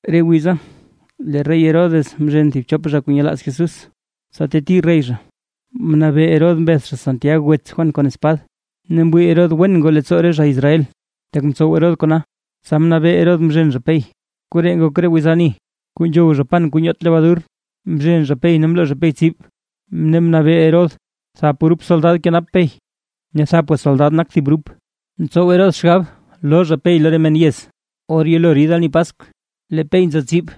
Re wiza lee rey Herodes mzhen thib chop re zha kuu nyelaaz Jesús, tsa teti rey zha. Mnabee Herodes mbeth zha Santiag wets Juan kon espad, ne mwii Herodes wen ngoo leettsoo re zha Israel, tak mtsow Herodes kona, tsa mnabee Herodes mzhen zha Pey, koree ngok re wiz ani kuu nzhow zha pan kuu nyoot lebadur. Mzhen zha Pey ne mloo zha Pey tsib, ne mnabee Herodes thap grup soldad kenap Pey, ne thapga soldad nak thib grup. Mtsow Herodes xgab loo zha Pey lo re men yez or yelo rid ani Paskw. Lee Pey nzo tsib,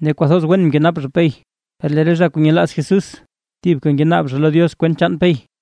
ne kwathoz wen mkenap zha Pey, per lee re zha kuu nyelaaz Jesús thibka ngenaab lo Diox kwent chaan Pey.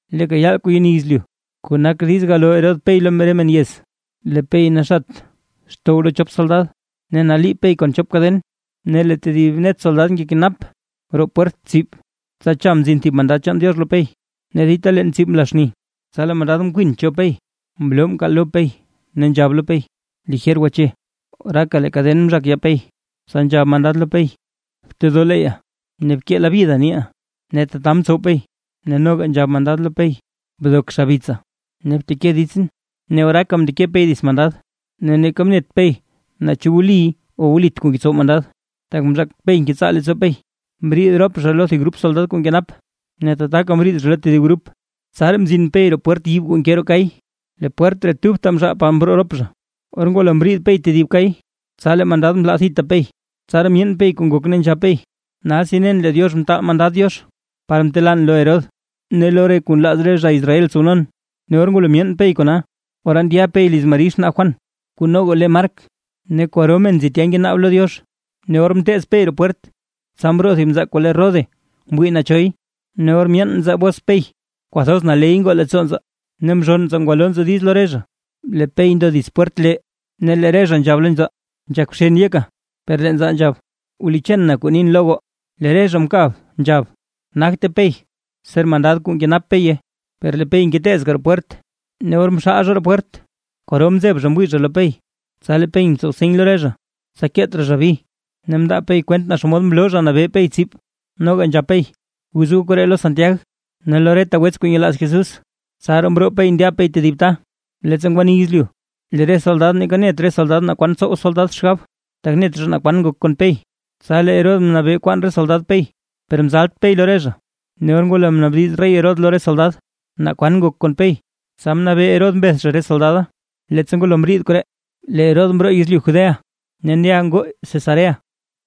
Leeka yaal kuu yeni yezlyu kuu nak diiz galoo Herodes Pey lo re men yez, lee Pey naxat xtow chop soldad, ne naliib Pey kon chop kaden, ne lee tedib net soldad ngekenap roo pwert tsib. Tsa cha mzin thib mandad chaan Diox lo Pey, ne dita leen tsib mla xni, tsa lee mandad mkwin cho Pey mloo mkaal lo Pey, ne nzhab lo Pey: ―¡Lijer gwache! Oraaka lee kaden mzhak yaa Pey. Tsa nzhab mandad lo Pey: ―Btedoo leeyya, ne bkee labyida niiʼa. Ne tata mtsow Pey, tsa nzhab mandad lo Pey: ―Bdok xabitsa ne bteke ditsʼn. Ne oraaka mndeke Pey dits mandad, ne neeka net Pey naa chu wli o wlit kuu ngetsow mandad, tak mzhaak Pey ngetsaa leettsoo Pey. Mbriid rop zha lo thib grup soldad kuu nkenap, ne tataka mriid zha lo tedib grup, tsaraa mzin Pey roo pwert yiib kuu nke roo kay. Lee pwert ree tubta mzhaal par mroo rop zha. Or ngwalo mriid Pey tedib kay, tsa lee mandad mlaa thita Pey. Tsaraa myeen Pey kuu ngok ne nzhab Pey: ―Nalsi nen lee Diox mtaal mandad Diox par mtelan lo Herodes ne lo re kuu nlaaz re zha Israel tsownon. Ne or ngwalo myeen Pey kona, ora ndya Pey liz Mari xnaa Juan kuu noga le Mark, ne kwaro men nzi tya ngenaab lo Diox. Ne or mteez Pey roo pwert, tsa mroo thib nzaa kuu le Rode wii naa choy. Ne or myeen nzaa bos Pey, kwathoz naley ngoo leettsoo nzaa, ne mzhonn nzaa ngwalo nzaa diiz lo re zha, lee Pey ndo dits pwert lee. Ne lee re zha nzhab lo nzaa: ―¡Nzhak bxen yeka! Per lee nzaa nzhab: ―Wlicheen na kuu nin lo goo. Lee re zha mkab nzhab: ―Nagte Pey, ser mandad kuu nkenap Peya. Per lee Pey ngeteezka roo pwert, ne or mxaal zha roo pwert kwaro mzeb re zha mwii zha lo Pey. Tsa lee Pey mtsow seny lo re zha, tsa keet raa zha bi ne mndaa Pey kwent naa xomod mloo Zha Nabee Pey tsib. Noga nzhab Pey: ―Guz goo koree lo Santiag ne lo reta wets kuu nyelaaz Jesús, tsaraa mroo Pey ndya tedib ta. Leettsa ngwani yezlyu, lee re soldad neeka net re soldad naa kwan tsow re soldad xgab, tak net zha naa kwan ngok kon Pey. Tsa lee Herodes mnabee kwaan re soldad Pey, per mzalt Pey lo re zha. Ne or ngwalo mnaabdiz rey Herodes lo re soldad, naa kwan ngok kon Pey, tsa mnabee Herodes mbeth zha re soldada. Leettsa ngwalo mriid koree, lee Herodes mroo yezlyu Judea ne ndya ngoo Cesarea.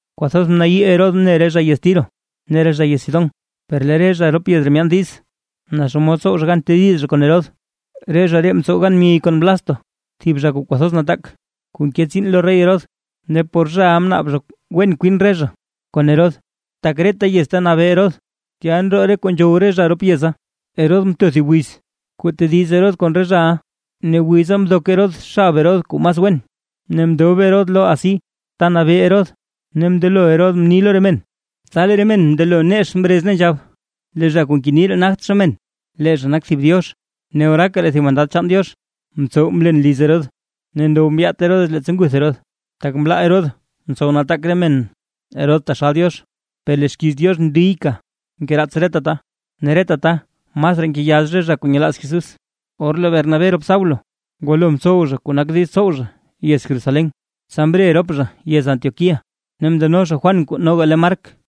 Kwathoz mnayii Herodes mne re zha yez Tiro ne re zha yez Sidón, per lee re zha rop yez ree myaan diiz, naa xomod tsow zha gan tediz zha kon Herodes, re zha ree mtsow gan myey kon Blasto, thib zha kuu kwathoz nataak, kuu nke tsiin lo rey Herodes, ne por zhaʼa mnaab zha wen kwin re zha kon Herodes, tak reta yez ta nabee Herodes, tya ndroo re kuu nzhow re zha rop yeza. Herodes mto thib wiz, kuu tediz Herodes kon re zhaʼa, ne wiza mdok Herodes xab Herodes kuu mas wen, ne mndob Herodes lo asi ta nabee Herodes ne mndelo Herodes mni lo re men. Tsa lee re men mndelo nex mrez ne nzhab: ―¡Lee zha kuu ngeni ree nagt zha men, lee zha nak thib diox! Ne oraaka lee thib mandad chaan Diox mtsow mlen liz Herodes, ne ndow mbyaat Herodes leettsa nguth Herodes. Tak mlaa Herodes mtsow nataak re men Herodes taxal Diox. Per lee xkiiz Diox ndiyka ngeraats reta ta, ne reta ta masraa ngeyax re zha kuu nyelaaz Jesús. Or lee Bernabé rop Saulo ngwalo mtsow zha kuu nak diiz tsow zha yez Jerusalén, tsa mre rop zha yez Antioquía ne mndeno zha Juan kuu noga le Mark.